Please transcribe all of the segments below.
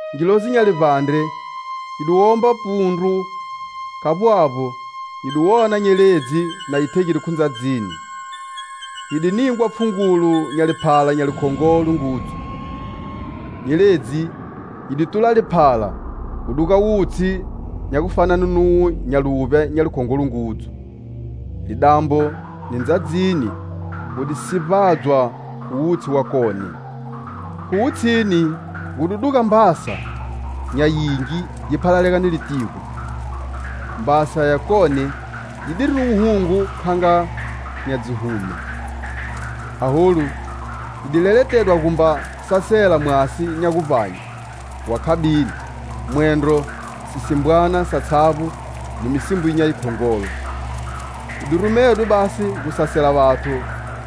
Ngilozi nya livbandre yi di womba pundru, khavbo avbo, nyi di wona nyeledzi na yi thegide khu ndzadzini. Yi di ningwa pfhungulo nya liphala nya likhongolo ngudzu. Nyeledzi yi di tula liphala gu duga wutshi nya gufane nuwo nya luvbya nya likhongolo ngudzu. Lidambo ni ndzadzini gu di sivbadzwa khu wutshi wakone. Khu wutshini gu di duga mbasa nya yingi yi phalalega ni litigo. Mbasa yakone yidiri ni wuhungu kha nga nya dzihume. Aholu, yi di leletedwa gumba sasela mwasi nya guvbanye wa khabini, mwendro sisimbwana satshavbo ni misimbo nya yikhongolo. Yi rumedwe basi gu sasela vathu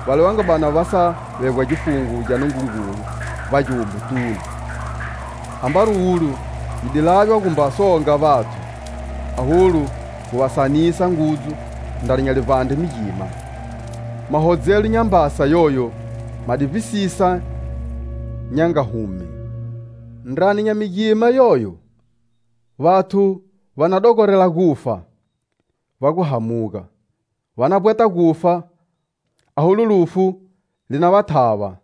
vale va nga bani va sa vegwa gifungo gya Nungungulu vbagiwombotunu. Ambari ulo yi di laywa gumba songa vathu, aholu gu va sanisa ngudzu ndrani nya livbandre migima. Mahodzelo nya mbasa yoyo ma di vbisisa nya nga hume. Ndrani nya migima yoyo, vathu va na dogorela gufa va gu hamuga, va na vbweta gufa, aholu, lufu li na va thava.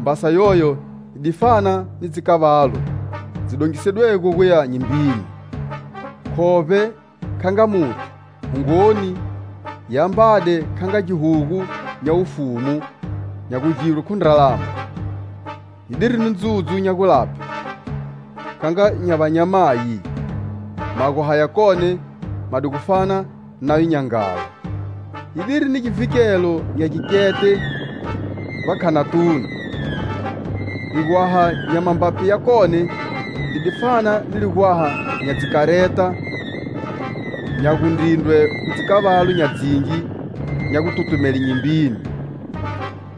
Mbasa yoyo yi di fana ni dzikavalu dzi dongisedwego guya nyimbini. Khovbe kha nga muthu, hungoni yi ambade kha nga gihugu nya wufumu nya gugirwe khu ndralama. Yidiri ni ndzudzu nya gulaphe kha nga nya vanyamayi; magwaha yakone ma di gu fana nayo nya nghala. Yidiri ni givhikelo nya gikete vbakhanatunu, ligwaha nya mambapi yakone li di fana ni ligwaha nya dzikareta nya gundrindrwe khu dzikavalu nya dzingi nya gututumele nyimbini.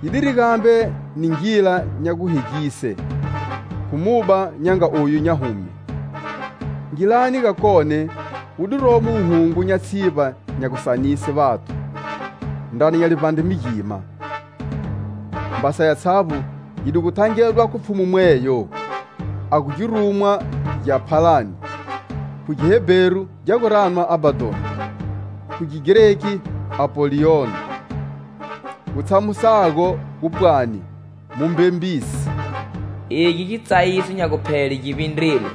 Yidiri gambe ni ngila nya guhegise khu muba nga oyu nya hume. Ngilani gakone wu diromo wuhungu nya tshivba nya gusanise vathu ndrani nya livbandre migima. Mbasa yatshavbo yi di gu thangedwa khu pfhumu mweyo a gu girumwa gya phalani. Khu Gihebheru gya gu ranwa "Abbadon" khu Gigreki "Apollion" gu tshamusago gu pwani "Mumbembisi." Egi gitsayiso nya guphele gi vbindrile.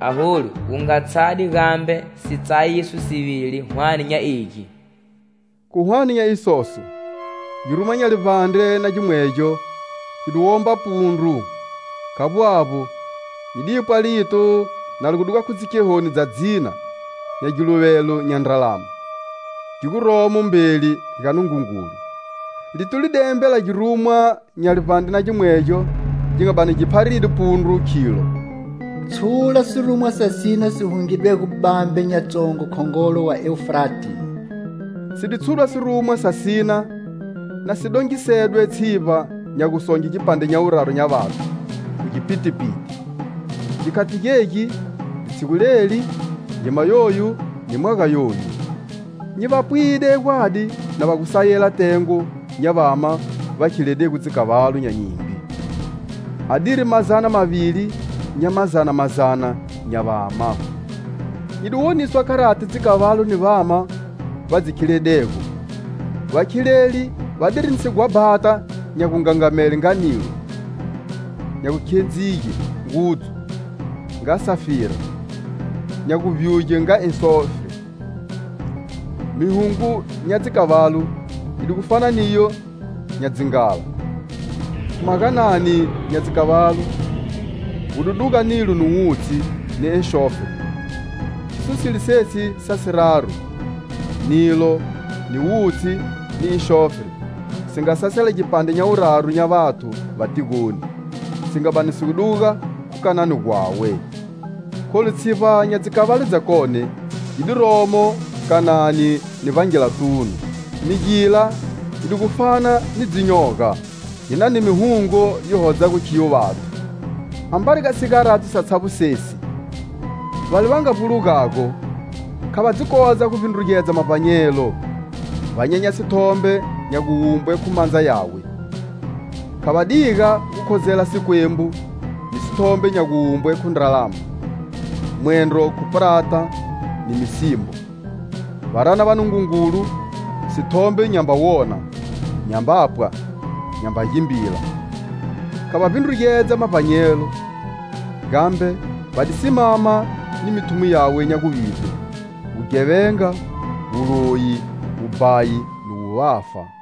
Aholu gu nga tshade gambe si tsayiso sivili hwane nya egi. Khu hwane nya isoso, girumwa nya livbandre na gimwegyo gi di womba pundru, khavbo avbo, nyi di pwa lito na li gu duga khu dzikhehoni dza dzina nya giluvelo nya ndralama, gi guromo mbeli ga Nungungulu. Lito li di embela girumwa nya livbandre na gimwegyo gi nga bani gi pharide pundru khilo: "Tshula sirumwa sa sina si hungidwego bambe nya tsongo khongolo wa Eufrate." Si di tshudwa sirumwa sa sina na si dongisede tshivba nya gusonge gipandre nya wuraru nya vathu khu gipitipiti, gikhati gegi, litshigu leli, ngima yoyu, ni mwaga yoyu. Nyi va pwide gwadi na va gu sayela tengo nya vama va khiledego dzikavalu nya nyimbi, adiri mazana mavili nya mazana mazana nya vama. Nyi di woniswa kharati dzikavalu ni vama va dzi khiledego: Vakhileli vadiri ni sighwabhata nya gungangamele nga nilo, nya gukhedzige ngudzu nga safira, nya gubyuge nga enxofre. Mihungo nya dzikavalu yi di gu fana niyo nya dzi nghala. Khu maganani nya dzikavalu gu di duga nilo ni wutshi ni enxofre. Khiso silo sesi sa siraru: nilo, ni wutshi ni enxofre si nga sasela gipandre nya wuraru nya vathu va tigoni, si nga bani si duga khu kanani gwawe. Kholu tshivba nya dzikavalu dzakone yi diromo kanani ni vbangilatunu. Migila yi di gu fana ni dzinyoga, yi nani mihungo yi hodzago khiyo vathu. Ambari ga sigaradzo satshavbo sesi, vale va nga vbulugago, kha va dzi kodza gu vbindrugedza mavbanyelo, va nyenya sithombe nya guwumbwe khu mandza yawe, kha va diga gu khozela sikwembu ni sithombe nya guwumbwe khu ndralama, mwendro khu prata, ni misimbo. Va rana vanungungulu sithombe nyamba wona, nyamba pwa, nyamba gimbila. Kha va vbindrugedza mavbanyelo, gambe va di simama ni mithumo yawe nya guvivbe: wughevenga, wuloyi, wubhayi ni wuvafa.